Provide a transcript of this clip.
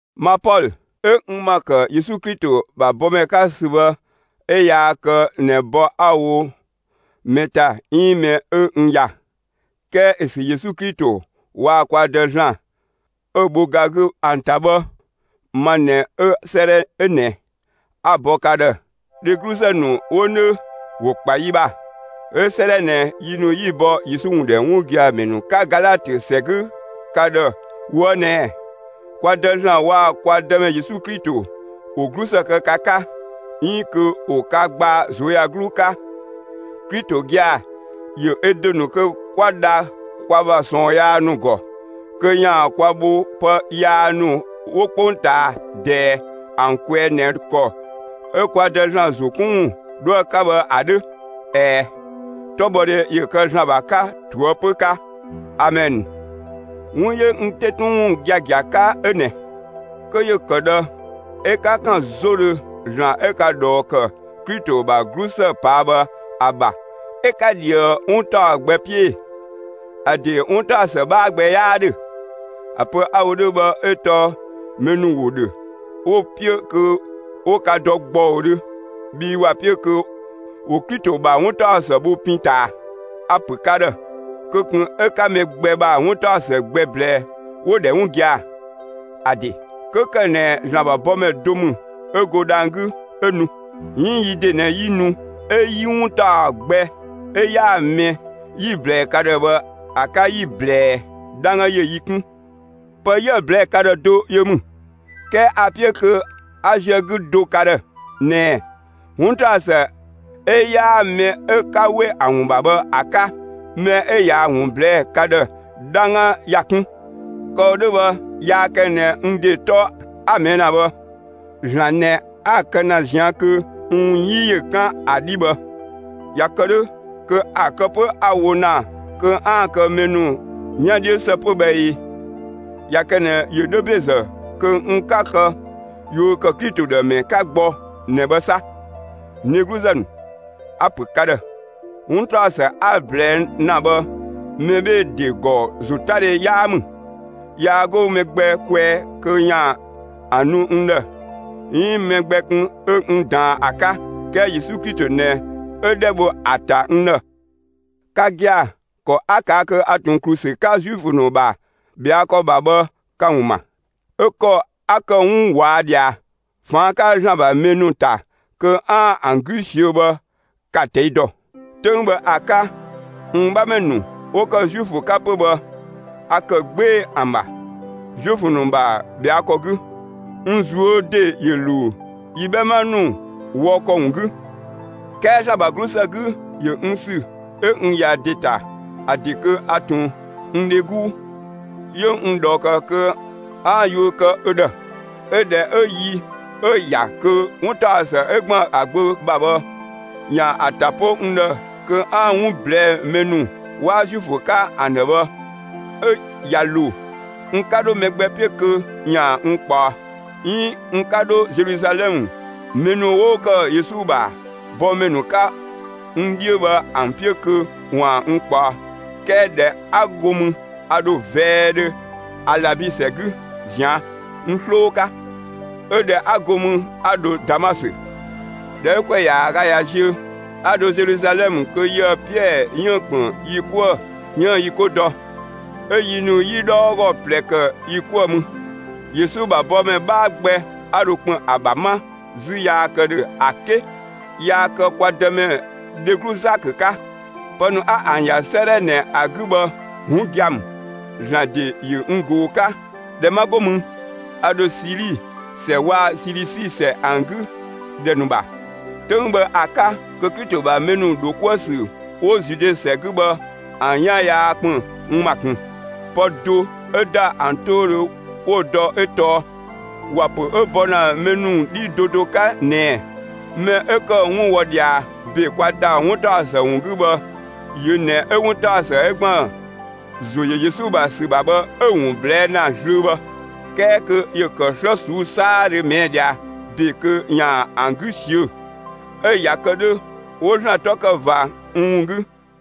Ma Pɔlö, 'ö n ‑ma ‑kë Yesu Klito ‑bha bɔmɛ 'ka ‑sü bhë 'ö yaa kë ꞊nɛ bɔ 'a‑ wo mɛ ‑ta 'iin mɛ 'ö n ‑ya, 'kɛɛ 'ö sü Yesu Klito waa‑ kwa Dë ‑Zlan 'ö‑ bho ga 'gü ‑an ‑ta bhë, ma ꞊nɛ 'ö 'sëëdhɛ 'ö ꞊nɛ 'a‑ bɔ ka ‑dhë. Dhegluzë ‑nu 'wo 'nö ‑wo ‑kpa yi ‑bha, 'ö 'sëëdhɛ ꞊nɛ, yi ‑nu 'yi‑ bɔ Yesu ‑wun ‑dhɛ 'wun gia‑ ‑mɛ ‑nu 'ka Galatö ‑sɛ 'gü ka ‑dhë ꞊woë' ꞊nɛɛ: Kwa Dë ‑Zlan waa‑ kwa Dëmɛ Yesu Klito ‑wo 'glusë kë ka 'ka, 'iin kö ‑wo ka gbaa ꞊zuöyagluu 'ka. Klito gia‑ ‑yö ö ‑de ‑nu kö 'kwa dha kwa ‑bha ꞊sɔɔn yaa ‑nu ‑gɔ, kö ‑yaan kwa bho pë yaa ‑nu 'wo 'kpongtaa ꞊dɛɛ ‑an kwɛɛ ꞊nɛ ‑kɔ 'ö kwa Dë ‑Zlan ‑zo 'kun ‑wun 'dhoë‑ 'ka bhë ‑a 'dhö. ꞊Ɛɛ, 'tɔbhɔdhe ‑yö kë ‑Zlan ‑bha 'ka ꞊toëpö 'ka! Amɛn. 'Wun 'yö n 'te 'tun ‑wun giagia 'ka 'ö ꞊nɛ: Kö ‑yö ‑kë ꞊dhë 'ö 'ka ‑kan 'zodhö ‑Zlan 'ö ka ꞊dhɔɔ ‑kë Klito ‑bha 'glusë ꞊paa' bhë ‑a ‑bha 'ö 'ka ꞊dhië 'wun ‑taɔ gbɛ 'piö ee? ‑A ‑de 'wuntaɔsë 'bhaa gbɛ 'yaa 'dhö. ‑A pö 'a‑ wo 'dhö bhë 'ö tɔɔ mɛ ‑nu ‑wo ‑dhö, 'wo‑ 'piö kö 'wo ka dɔ ‑gbɔudhö, bhii ‑wa 'piö kö ‑wo Klito ‑bha 'wuntaɔsë bho pin ꞊taa. A‑ ‑pö ka ‑dhë: Kö ꞊kun 'ö 'ka mɛ gbɛ ‑bha 'wuntaɔ gbɛ ꞊blɛɛ' ‑wo ‑dhɛ 'wun gia‑. ‑A ‑de, 'kö ‑kë ꞊nɛ ‑Zlan ‑bha bɔmɛ do ‑mü 'ö go dhang‑ 'gü, 'ö nu, 'iin yi ‑de ꞊nɛ 'yi nu 'ö 'yi 'wun ‑taɔ gbɛ 'ö 'yaa‑ mɛ 'yi‑ ꞊blɛɛ ka ‑dhë bhë ‑a 'ka 'yi‑ ꞊blɛɛ, 'dhangga ‑yö yi 'kun. Pë 'yië‑ ꞊blɛɛ'‑ ka ‑dhë do yö ‑mü; 'kɛɛ a‑ 'piö kö 'a ziö‑ 'gü do ka ‑dhë ꞊nɛɛ: 'Wuntaɔsë 'ö 'yaa‑ mɛ 'ö 'ka ‑we ‑a ‑wun ‑bha bhë ‑a 'ka, mɛ 'ö ꞊yaa‑ ‑wun ꞊blɛɛ'‑ ka ‑dhë, 'dhangga ‑ya 'kun. Kë‑ wo 'dhö bhë, yaa kë ꞊nɛ n ‑de 'tɔ 'a‑ ꞊mɛɛ' ‑na bhë. ‑Zlan ꞊nɛ 'a‑ kë ‑na ꞊zian' kö n ‑wun 'yi ‑yö 'kan ‑a 'dhi bhë. ꞊Ya kë 'dhö, kö ‑a kë 'pö 'a‑ wo ‑na kö 'aan‑ kë mɛ ‑nu 'yan 'dhiö ‑së 'pö bhë ꞊ee? ꞊Ya kë ꞊nɛ ‑yö 'dhö ‑bezë kö n 'ka kë yuö ‑kë Klito ‑dhë ‑mɛ 'ka gbɔ ꞊nɛ bhë 'sa. N dhegluzë ‑nu, a‑ ‑pö ka ‑dhë: 'Wuntaɔsë 'a‑ ꞊blɛɛ' ‑na bhë, mɛ 'bhee‑ ‑de ‑gɔ ‑zotadhe 'yaa ‑mü. Yaa 'go mɛ gbɛ kwɛɛ kö ‑yaan ‑a nu n ‑dhë 'iin mɛ gbɛ kun 'ö n ꞊daan ‑a 'ka; 'kɛɛ Yesu Klito ꞊nɛ 'ö 'dhɛ bho ‑a ‑ta n ‑dhë. Ka gia‑, ‑kɔ 'a ꞊kaa' kö a ꞊tun ‑klu ‑sü 'ka Zuifö ‑nu ‑bha ꞊bhɛa' ‑kɔ ‑bha bhë ka‑ ‑wun ‑ma; 'ö ‑kɔ 'a ‑kë 'wun ꞊wɔa' ꞊dhia ꞊faan' 'ka ‑Zlan ‑bha mɛ ‑nu ‑ta kö 'aan‑ ‑an 'gü ꞊siö' bhë 'ka‑ ꞊tɛi' dɔ. 'Töng bhë ‑a 'ka, n 'bhamɛ ‑nu 'wo ‑kë Zuifö 'ka 'pö bhë, a ‑kë 'gbee‑ ‑an ‑bha, Zuifö ‑nu ‑bha ꞊bhɛa' ‑kɔ 'gü. N ꞊zuö' ‑de ‑yö ‑luu yi 'bhɛma ‑nu wɔ ‑kɔ ‑wun 'gü. 'Kɛɛ ‑Zlan ‑bha 'glusë 'gü, ‑yö n ‑sü 'ö n ‑ya ‑de ‑ta, ‑a ‑de kö a ꞊tun n dhe 'guu, 'yö n ꞊dhɔɔ ‑kë kö 'a yuö kë ö ‑dhë. 'Ö ꞊dhɛ 'ö yi 'ö‑ ‑ya kö 'wuntaɔsë 'ö ‑gban ‑a Gbö ‑bha bhë, ‑yaan ‑a ‑ta 'po n ‑dhë kö 'aan‑ ‑wun ꞊blɛɛ'‑ mɛ ‑nu 'waa Zuifö 'ka ‑an ‑dhë bhë, 'ö ꞊ya ‑lo, n 'ka 'dho mɛ gbɛ 'piö kö ‑yaan n ꞊kpaɔ, 'iin n 'ka 'dho Zeluzalɛmë, mɛ ‑nu 'wo ‑kë Yesu ‑bha bɔmɛ ‑nu 'ka n 'dhiö bhë ‑an 'piö kö ‑waan n ꞊kpaɔ. 'Kɛɛ ꞊dhɛ 'a go mü a ‑dho vɛɛdhö Alabi ‑sɛ 'gü ꞊zian' (n 'sloo 'ka); 'ö ꞊dhɛ 'a go mü, 'a dho Damasö. ꞊Dhɛ 'ö ‑kwɛ ‑yaaga ꞊ya ziö, 'a dho Zeluzalɛmë kö yië‑ Piɛɛ 'yiën‑ ‑kpën yi 'kuë‑ 'yiën‑ yi 'ko dɔ. 'Ö yi ‑nu 'yi 'dhɔɔgɔ ꞊plɛ ‑kë yi 'kuë‑ mü. Yesu ‑bha bɔmɛ 'bhaa gbɛ 'a dho ‑kpën ‑a ‑bha 'ma 'zü yaa ‑kë ‑dhö ‑a 'ke yaa kë kwa Dëmɛ dheglu Zakö 'ka. Pë ‑nu 'a ‑an ‑ya 'sëëdhɛ ꞊nɛ ‑a 'gü bhë, 'wun gia‑ ‑mü; ‑Zlan ‑de ‑yö n ꞊goo‑ 'ka. ꞊Dhɛ 'ma 'go mü, a ‑dho Sili ‑sɛ waa‑ Silisi ‑sɛ ‑an 'gü ‑dhɛ ‑nu ‑bha. 'Töng bhë ‑a 'ka, kö Klito ‑bha mɛ ‑nu ‑dho 'kuë‑ ‑sü 'wo Zude ‑sɛ 'gü bhë, ‑an 'yan yaa ‑kpën n ‑ma ꞊kun. Pë do 'ö ‑da ‑an 'toudhö 'wo‑ dɔ 'ö tɔɔ ‑wa ‑pö 'ö bɔ ‑na mɛ ‑nu 'dhii do do 'ka ꞊nɛɛ: «Mɛ 'ö ‑kë 'wun wɔ ꞊dhia ‑be kwa ‑ta 'wuntaɔsë ‑wun 'gü bhë, yö ꞊nɛ 'ö 'wuntaɔsë 'ö ‑gban ‑zo ‑yö Yesu ‑bha ‑sü ‑bha bhë 'ö‑ ‑wun ꞊blɛɛ' ‑na zlöö bhë; 'kɛɛ kö ‑yö ‑kë 'slë ꞊suu'‑ 'saadhö ꞊mɛɛ' ꞊dhia ‑be kö ‑yaan ‑an 'gü ꞊siö'‑.» 'Ö ꞊ya kë 'dhö, 'wo ‑Zlan 'tɔ ‑kë ꞊va n ‑wun 'gü.